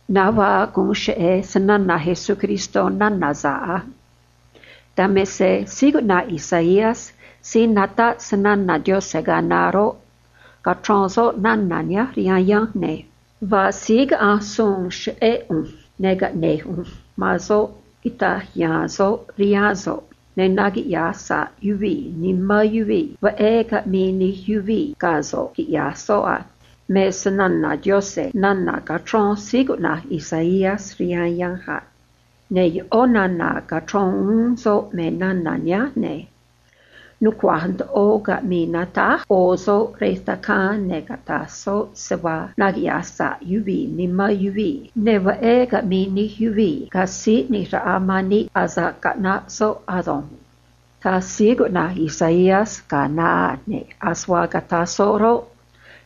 Na̱nj vaa guun cheꞌe̱ se‑na̱na̱ Jesucristó nana̱ sa̱ꞌ a. Dan me se síí cuꞌna̱j Isaías síí nataꞌ se‑na̱na̱ Diose̱ ga̱a naá roꞌ, cachrón soꞌ nana̱ nihánj rihaan yanj, ne̱: “Vaa síí caꞌanj suun cheꞌé ꞌu̱nj, ne̱ caꞌne̱j ꞌu̱nj man soꞌ quita̱j ya̱a̱n soꞌ rihaan so̱ꞌ, ne̱ nuchra̱nꞌ nimán yuvii̱ veꞌé caꞌmi̱i̱ nij yuvii̱ ga̱ so̱ꞌ, quiꞌya̱j soꞌ a”, me se‑na̱na̱ Diose̱ nana̱ cachrón síí cuꞌna̱j Isaías rihaan yanj a. Ne̱ yoꞌó nana̱ cachrón uún soꞌ me nana̱ nihánj, ne̱: “Nucua̱j ndoꞌo caꞌmi̱i̱ natáj ꞌo̱ soꞌ rej tacaan, ne̱ cata̱j soꞌ se vaa nuchra̱nꞌ nimán yuvii̱, ne̱ veꞌé caꞌmi̱i̱ nij yuvii̱ ga̱ síí ꞌni̱j raꞌa man níꞌ asa̱ꞌ caꞌnaꞌ soꞌ ado̱nj”, taj síí cuꞌna̱j Isaías ga̱a naá, ne̱ ase vaa cataj soꞌ roꞌ,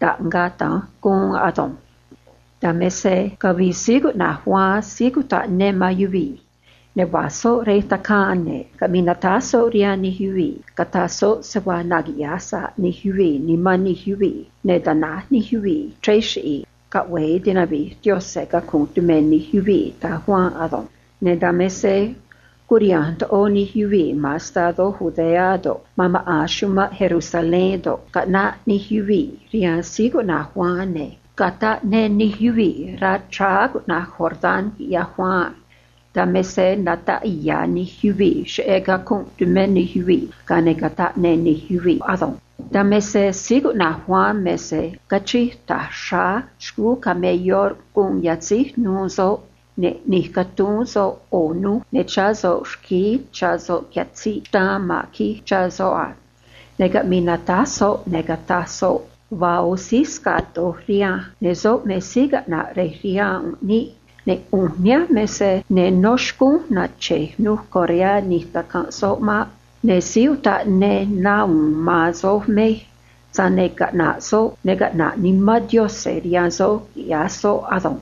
taꞌngaꞌ da̱nj guun ado̱nj. Dan me se cavii síí cuꞌna̱j Juan síí cutaꞌ ne man yuvii̱, ne̱ va̱j soꞌ rej tacaan, ne̱ caꞌmii natáj soꞌ rihaan nij yuvii̱, cataj soꞌ se vaa nuchra̱nꞌ nimán nij yuvii̱, ne̱ ta̱náj nij yuvii̱ chrej chiꞌi̱i̱, ne̱ caꞌve̱e tinavi̱j Diose̱ cacunꞌ tumé nij yuvii̱, taj Juan ado̱nj. Ne̱ dan me se curiha̱nj ndoꞌo nij yuvii̱ ma̱n estadó Judea do̱ꞌ, ma̱n maꞌa̱n chumanꞌ Jerusalén do̱ꞌ, caꞌnaꞌ nij yuvii̱ rihaan síí cuꞌna̱j Juan, ne̱ cataꞌ ne nij yuvii̱ rá chráá cuꞌna̱j Jordán, quiꞌyaj Juan a. Dan me se nataꞌ ya̱ nij yuvii̱ cheꞌé cacunꞌ tumé nij yuvii̱, ga̱a ne̱ cataꞌ ne nij yuvii̱ ado̱nj. Dan me se síí cuꞌna̱j Juan me se cachij ta̱j xráá xcuu camelló guun yatzíj nu̱u̱ soꞌ, ne̱ ꞌni̱j catuu̱n soꞌ ꞌo̱ nuj, ne̱ chá soꞌ rquíí chá soꞌ catziꞌ xtaan ma̱n quij chá soꞌ a. Ne̱ caꞌmii natáj soꞌ, ne̱ cataj soꞌ: ―Vaa ꞌo̱ síí sca̱ꞌ doj rihanj, ne̱ soꞌ me síí caꞌna̱ꞌ rej riha̱a̱n níꞌ, ne̱ ꞌu̱nj nihánj me se ne nó xcúnj na̱chej nuj correá ꞌni̱j tacanj soꞌ maꞌ. Ne̱ síí utaꞌ ne na u̱u̱n man soj mej, tza̱j ne̱ caꞌna̱ꞌ soꞌ, ne̱ caꞌna̱ꞌ Nimán Diose̱ rihaan soj, quiꞌya̱j soꞌ ado̱nj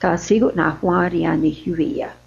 ―taj síí cuꞌna̱j Juan rihaan nij yuvii̱ a.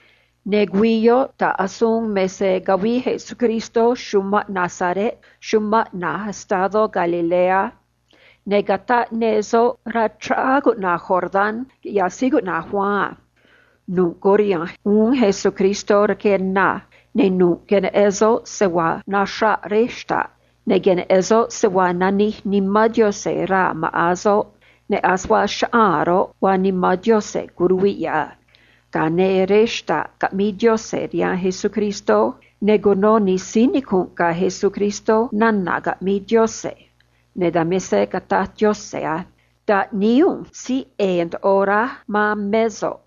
Ne̱ güii yoꞌ ta̱ꞌ asuun me se cavii Jesucristó chumanꞌ Nazaret chumanꞌ na̱j estadó Galilea, ne̱ cataꞌ ne soꞌ rá chráá cuꞌna̱j Jordán, quiꞌyaj síí cuꞌna̱j Juan a. Nu̱ꞌ curiha̱nj uún Jesucristó rque na, ne̱ nu̱ꞌ queneꞌen soꞌ se vaa naxraꞌ rej xta̱ꞌ, ne̱ queneꞌen soꞌ se vaa nanij Nimán Diose̱ raa̱ maꞌa̱n soꞌ, ne̱ ase vaa chaꞌaa̱n roꞌ, vaa Nimán Diose̱, curuviꞌ yoꞌ a. Ga̱a ne̱ rej xta̱ꞌ caꞌmii Diose̱ rihaan Jesucristó, ne̱ cuno nij síí nicu̱nꞌ ga̱ Jesucristó nana̱ caꞌmii Diose̱, ne̱ dan me se cataj Diose̱ a: ―Taꞌníí ꞌu̱nj síí ꞌe̱e̱ ndoꞌo raj man mé so̱ꞌ,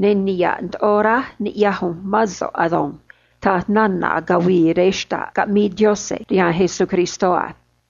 ne̱ niha̱ꞌ ndoꞌo raj niꞌya̱j ꞌu̱nj mán so̱ꞌ ado̱nj ―taj nana̱ cavii rej xta̱ꞌ caꞌmii Diose̱ rihaan Jesucristó a.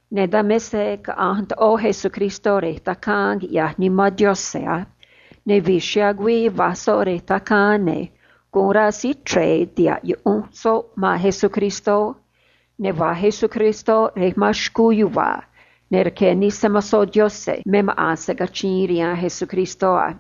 Ne̱ dan me se caꞌanj ndoꞌo Jesucristó rej tacaan, quiꞌyaj Nimán Diose̱ a. Ne̱ vi̱j chiha̱a̱ güii va̱j soꞌ rej tacaan, ne̱ guun rá síí chre̱e tiha̱ꞌ yuꞌunj soꞌ man Jesucristó, ne̱ va̱j Jesucristó rej ma̱n xcuu yuva̱a̱, ne̱ rqué nij se‑mo̱zó Diose̱ me maꞌa̱n se cachiin rihaan Jesucristó a.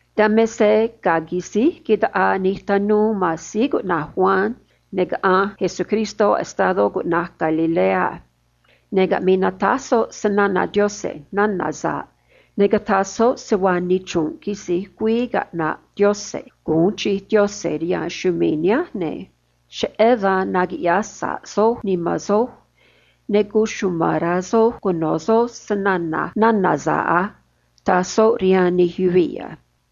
Dan me se ga̱a quisíj quitaꞌaa nij tanuu man síí cuꞌna̱j Juan, ne̱ caꞌanj Jesucristó estadó cuꞌna̱j Galilea, ne̱ caꞌmii natáj soꞌ se‑na̱na̱ Diose̱ nana̱ sa̱ꞌ, ne̱ cataj soꞌ se vaa nichru̱nꞌ quisi̱j güii caꞌna̱ꞌ Diose̱ gu̱un chij Diose̱ rihaan chumii̱ nihánj, ne̱: ―Cheꞌé dan nuchra̱nꞌ nimán soj, ne̱ cuchuma̱n rá soj cuno̱ soj se‑na̱na̱j nana̱ sa̱ꞌ á ―taj soꞌ rihaan nij yuvii̱ a.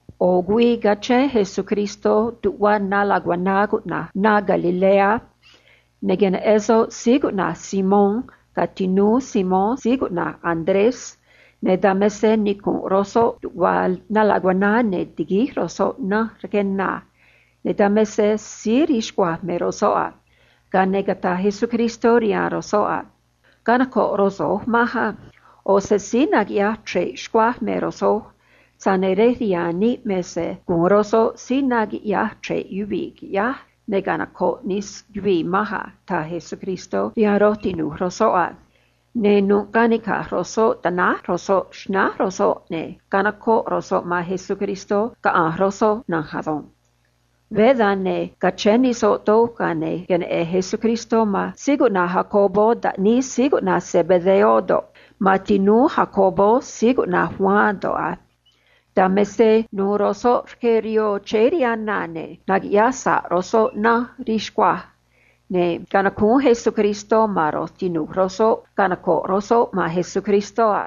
ꞌO̱ güii cachén Jesucristó tuꞌva na lacuaná cuꞌna̱j na Galilea, ne̱ queneꞌen soꞌ síí cuꞌna̱j Simón ga̱ tinúú Simón síí cuꞌna̱j Andrés, ne̱ dan me se nicu̱nꞌ ro̱j soꞌ tuꞌva na lacuaná, ne̱ tiguíj ro̱j soꞌ nanj rque na, ne̱ dan me se síí rii xcuaj me ro̱j soꞌ a. Ga̱a ne̱ cataj Jesucristó rihaan ro̱j soꞌ a: ―Canoco̱ꞌ ro̱j so̱j manj á. ꞌO̱ se síí naquiꞌyaj chre̱ꞌ xcuaj me ro̱j so̱j, tza̱j ne̱ rej riha̱a̱n níꞌ me se gu̱un ro̱j so̱j síí naquiꞌyaj chre̱ꞌ yuvii̱, qui̱ꞌyáj, ne̱ canoco̱ꞌ nij yuvii̱ manj a ―taj Jesucristó rihaan ro̱j tinu̱j ro̱j soꞌ a. Ne̱ nu̱ꞌ canica̱j ro̱j soꞌ tanáj ro̱j soꞌ xnánj ro̱j soꞌ, ne̱ canocoꞌ ro̱j soꞌ man Jesucristó, caꞌanj ro̱j soꞌ na̱nj ado̱nj. Veé dan, ne̱ cachéé nij soꞌ doj, ga̱a ne̱ queneꞌen Jesucristó man síí cuꞌna̱j Jacobo taꞌníí síí cuꞌna̱j Zebedeo do̱ꞌ, man tinúú Jacobo síí cuꞌna̱j Juan do̱ꞌ a. Dan me se nu̱u̱ ro̱j soꞌ rque rihoo chéé rihaan na, ne̱ naquiꞌyaj sa̱ꞌ ro̱j soꞌ nanj rii xcuaj, ne̱ canacúún Jesucristó man ro̱j tinu̱j ro̱j soꞌ canoco̱ꞌ ro̱j soꞌ man Jesucristó a.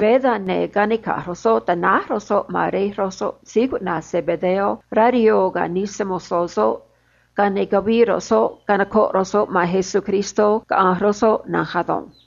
Veé dan, ne̱ canica̱j ro̱j soꞌ, tanáj ro̱j soꞌ man rej ro̱j soꞌ síí cuꞌna̱j Zebedeo rá rihoo ga̱ nij se‑mo̱zó soꞌ, ga̱a ne̱ cavii ro̱j soꞌ canocoꞌ ro̱j soꞌ man Jesucristó, caꞌanj ro̱j soꞌ na̱nj ado̱nj.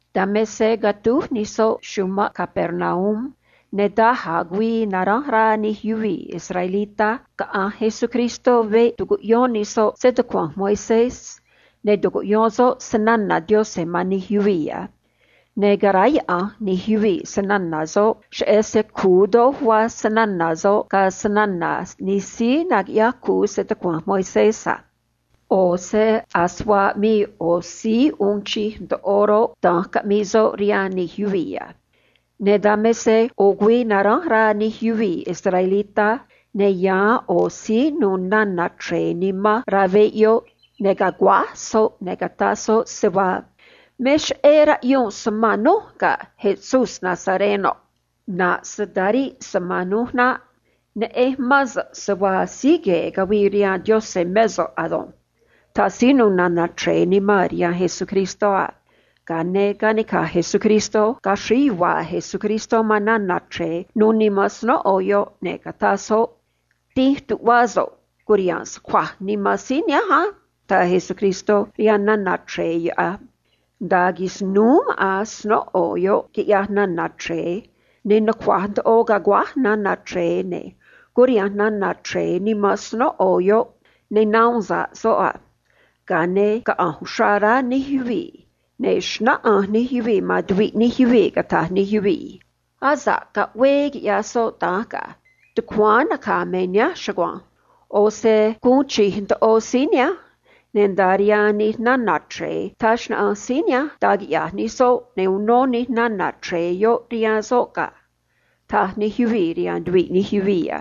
Dan me se catúj nij soꞌ chumanꞌ Capernaum, ne̱ daj a̱ güii naránj rá nij yuvii̱ israelitá caꞌanj Jesucristó veꞌ tucuꞌyón nij soꞌ se‑tucua̱nj Moisés, ne̱ tucuꞌyón soꞌ se‑na̱na̱ Diose̱ man nij yuvii̱ a. Ne̱ caráyaꞌa̱nj nij yuvii̱ se‑na̱na̱ soꞌ, cheꞌé se cu̱u doj vaa se‑na̱na̱ soꞌ ga̱ se‑na̱na̱ nij síí naquiꞌyaj cu̱u se‑tucua̱nj Moisés a. ꞌO̱ se ase vaa aꞌmii ꞌo̱ síí uun chij ndoꞌo roꞌ, da̱nj caꞌmii soꞌ rihaan nij yuvii̱ a. Ne̱ dan me se ꞌo̱ güii naránj rá nij yuvii̱ israelitá, ne̱ yáán ꞌo̱ síí nu̱u̱ nana̱ chre̱e nimán rá veꞌ yoꞌ, ne̱ caguáj soꞌ, ne̱ cataj soꞌ se vaa: ―Me cheꞌé raꞌyunj so̱ꞌ man núj, ga̱ Jesús Nazarenoꞌ. ꞌNa̱ꞌ so̱ꞌ ta̱ríꞌ so̱ꞌ man núj naꞌ. Neꞌenj mán so̱ꞌ se vaa síí gue̱e̱ cavii rihaan Diose̱ mé so̱ꞌ ado̱nj ―taj síí nu̱u̱ nana̱ chre̱e nimán rihaan Jesucristó a. Ga̱a ne̱ canica̱j Jesucristó, caxríj yuva̱a̱ Jesucristó man nana̱ chre̱e nu̱u̱ nimán snóꞌo yoꞌ, ne̱ cataj soꞌ: ―Dínj tuꞌvá so̱ꞌ, cu̱riha̱nj so̱ꞌ cuaj nimán síí nihánj á ―taj Jesucristó rihaan nana̱ chre̱e yoꞌ a. Nda̱a quisnúú maꞌa̱n snóꞌo yoꞌ, quiꞌyaj nana̱ chre̱e, ne̱ nucua̱j ndoꞌo caguáj nana̱ chre̱e, ne̱ curiha̱nj nana̱ chre̱e nimán snóꞌo yoꞌ, ne̱ nahuun sa̱ꞌ soꞌ a. Ga̱a ne̱ caꞌanj uxrá rá nij yuvii̱, ne̱ xnáꞌanj nij yuvii̱ man tuviꞌ nij yuvii̱, cataj nij yuvii̱: ―Asa̱ꞌ caꞌvee quiꞌyaj soꞌ da̱nj ga̱. Tucuáán naca̱ me nihánj chugua̱nj. ꞌO̱ se guun chij ndoꞌo síí nihánj, ne̱ nda̱a rihaan nij nana̱ chre̱e taj xnaꞌanj síí nihánj da̱j quiꞌya̱j nij soꞌ, ne̱ uno nij nana̱ chre̱e yoꞌ rihaan soꞌ ga̱ ―taj nij yuvii̱ rihaan tuviꞌ nij yuvii̱ a.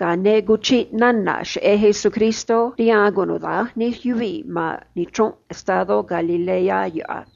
Ga̱a ne̱ cuchiꞌ nana̱ cheꞌé Jesucristó rihaan cunuda̱nj nij yuvii̱ ma̱n nichru̱nꞌ estadó Galilea yoꞌ a.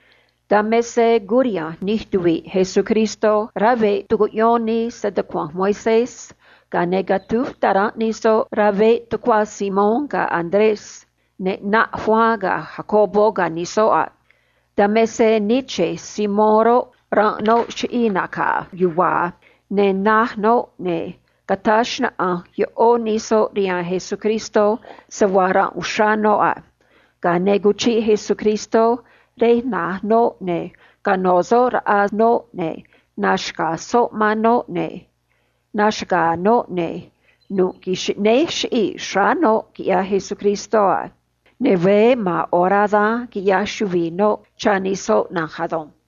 Dan me se curiha̱nj nij tuvi̱ꞌ Jesucristó rá veꞌ tucuꞌyón nii se‑tucua̱nj Moisés, ga̱a ne̱ catúj taranꞌ nij soꞌ rá veꞌ tucuá Simón ga̱ Andrés, ne̱ ꞌnaꞌ Juan ga̱ Jacobo ga̱ nij soꞌ a. Dan me se nii che̱j Simón roꞌ, ranꞌ noꞌ chiꞌii̱ nacaa yuva̱a̱, ne̱ na̱j noꞌ, ne̱ cataj xnaꞌanj yoꞌo̱ nij soꞌ rihaan Jesucristó se vaa ranꞌ uxrá noꞌ a. Ga̱a ne̱ cuchiꞌ Jesucristó rej na̱j noꞌ, ne̱ canó soꞌ raꞌa noꞌ, ne̱ naxca̱j soꞌ man noꞌ, ne̱ naxaga̱a̱ noꞌ, ne̱ nu̱ꞌ xꞌnéj chiꞌii̱ xráá noꞌ, quiꞌyaj Jesucristó a. Ne̱ veé ma̱a̱n orá dan quiꞌyaj chuvi̱i noꞌ cha̱ nij soꞌ na̱nj ado̱nj.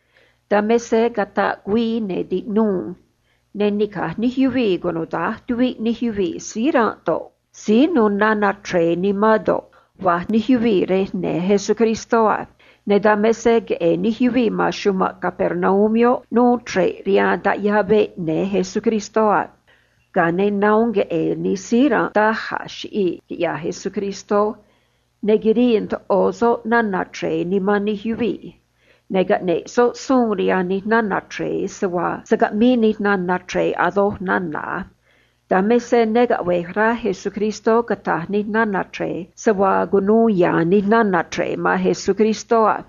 Dan me se cataꞌ güii, ne̱ tiꞌnuu, ne̱ nica̱j nij yuvii̱ cunuda̱nj tuviꞌ nij yuvii̱ síí ranꞌ do̱ꞌ, síí nu̱u̱ nana̱ chre̱e nimán do̱ꞌ, va̱j nij yuvii̱ rej ne̱ Jesucristó a. Ne̱ dan me se queꞌe̱e̱ nij yuvii̱ ma̱n chumanꞌ Capernaum yoꞌ nuu chre̱ꞌ rihaan taꞌyaa veꞌ ne̱ Jesucristó a. Ga̱a ne̱ nahuun queꞌe̱e̱ nij síí ranꞌ daj a̱ chiꞌii̱, quiꞌyaj Jesucristó, ne̱ quirii ndoꞌo soꞌ nana̱ chre̱e nimán nij yuvii̱, ne̱ caꞌneꞌ soꞌ suun rihaan nij nana̱ chre̱e se vaa se̱ caꞌmii nij nana̱ chre̱e a̱ doj nana̱ a. Dan me se ne caꞌve̱j rá Jesucristó cata̱j nij nana̱ chre̱e se vaa cunuu ya̱a̱n nij nana̱ chre̱e man Jesucristó a.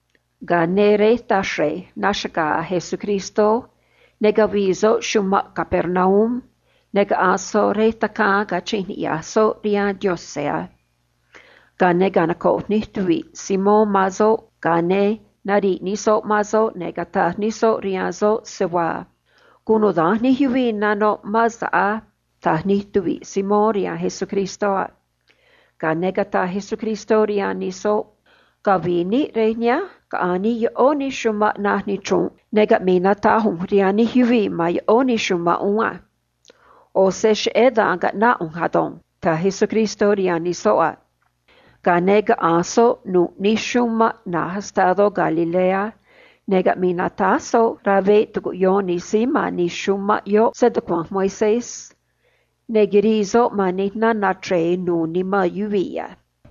Ga̱a ne̱ rej taxre̱j naxaga̱a̱ Jesucristó, ne̱ cavii soꞌ chumanꞌ Capernaum, ne̱ caꞌanj soꞌ rej tacaan cachi̱nj niꞌya̱j soꞌ rihaan Diose̱ a. Ga̱a ne̱ canocoꞌ nij tuvi̱ꞌ Simón man soꞌ, ga̱a ne̱ nariꞌ nij soꞌ man soꞌ, ne̱ cataj nij soꞌ rihaan soꞌ se vaa: ―Cunuda̱nj nij yuvii̱ nanoꞌ mán so̱ꞌ á ―taj nij tuvi̱ꞌ Simón rihaan Jesucristó a. Ga̱a ne̱ cataj Jesucristó rihaan nij soꞌ: ―Cavi̱i̱ níꞌ rej nihánj, caꞌa̱nj níꞌ yoꞌó nij chumanꞌ na̱j nichru̱nꞌ, ne̱ caꞌmi̱i̱ natáj ꞌu̱nj rihaan nij yuvii̱ ma̱n yoꞌó nij chumanꞌ uún á. ꞌO̱ se cheꞌé dan caꞌnáꞌ ꞌu̱nj ado̱nj ―taj Jesucristó rihaan nij soꞌ a. Ga̱a ne̱ caꞌanj soꞌ nu̱ꞌ nij chumanꞌ na̱j estadó Galilea, ne̱ caꞌmii natáj soꞌ rá veꞌ tucuꞌyón nij síí ma̱n nij chumanꞌ yoꞌ se‑tucua̱nj Moisés, ne̱ quirii soꞌ man nij nana̱ chre̱e nu̱u̱ nimán yuvii̱ a.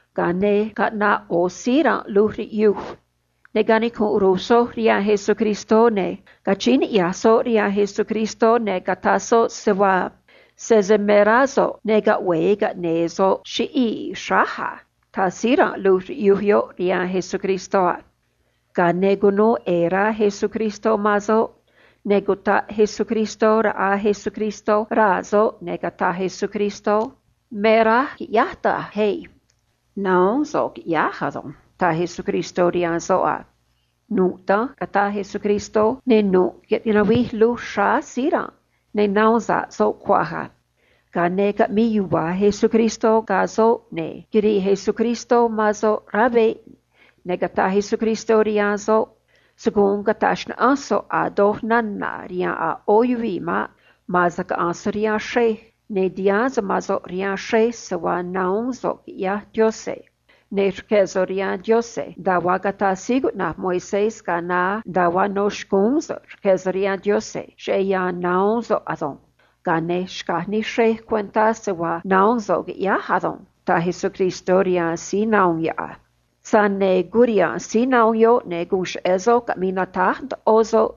Ga̱a ne̱ caꞌnaꞌ ꞌo̱ síí ranꞌ luj riꞌyuj, ne̱ canicunꞌ ru̱j soꞌ rihaan Jesucristó, ne̱ cachíín niꞌya̱j soꞌ rihaan Jesucristó, ne̱ cataj soꞌ se vaa: ―Sese me rá so̱ꞌ, ne̱ caꞌve̱e caꞌne̱e̱ so̱ꞌ chiꞌii̱ xráj á ―taj síí ranꞌ luj riꞌyuj yoꞌ rihaan Jesucristó a. Ga̱a ne̱ cunuu ꞌe̱e̱ rá Jesucristó man soꞌ, ne̱ cutaꞌ Jesucristó raꞌa Jesucristó raa̱ soꞌ, ne̱ cataj Jesucristó: ―Me raj qui̱ꞌyáj da̱nj ei. Na̱huún so̱ꞌ qui̱ꞌyáj ado̱nj ―taj Jesucristó rihaan soꞌ a. Nu̱ꞌ da̱nj cataj Jesucristó, ne̱ nu̱ꞌ quinavij luj xráá síí ranꞌ, ne̱ nahuun sa̱ꞌ soꞌ cuaj a. Ga̱a ne̱ caꞌmii yuva̱a̱ Jesucristó ga̱ soꞌ, ne̱ quirii Jesucristó man soꞌ rá veꞌ, ne̱ cataj Jesucristó rihaan soꞌ: ―Se̱ guun cata̱j xnaꞌanj so̱ꞌ a̱ doj nana̱ rihaan a̱ ꞌó yuvii̱ maꞌ. Ma̱a̱n se caꞌa̱nj so̱ꞌ rihaan xrej, ne̱ ti̱haán so̱ꞌ mán so̱ꞌ rihaan xrej se vaa nahuún so̱ꞌ, quiꞌyaj Diose̱, ne̱ rque̱ so̱ꞌ rihaan Diose̱ nda̱a vaa cataj síí cuꞌna̱j Moisés ga̱a naá nda̱a vaa no̱ xcúún so̱ꞌ rque̱ so̱ꞌ rihaan Diose̱ cheꞌé yan nahuún so̱ꞌ ado̱nj. Ga̱a ne̱ xca̱j nij xrej cuentá se vaa nahuún so̱ꞌ quiꞌyáj ado̱nj ―taj Jesucristó rihaan síí nahuun yoꞌ a. Tza̱j ne̱ curiha̱nj síí nahuun yoꞌ, ne̱ guun cheꞌe̱ soꞌ caꞌmii natáj ndoꞌo soꞌ,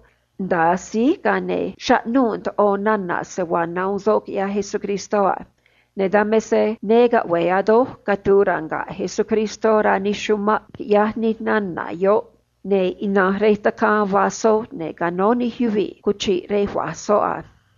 nda̱a síj, ga̱a ne̱ chaꞌnuu̱ ndoꞌo nana̱ se vaa nahuun soꞌ quiꞌyaj Jesucristó a. Ne̱ dan me se ne caꞌve̱e a̱ doj catu̱u̱ ranga̱ꞌ Jesucristó rá nij chumanꞌ, quiꞌyaj nij nana̱ yoꞌ, ne̱ ina̱nj rej tacaan va̱j soꞌ, ne̱ canó nij yuvii̱ cuchiꞌ rej va̱j soꞌ a.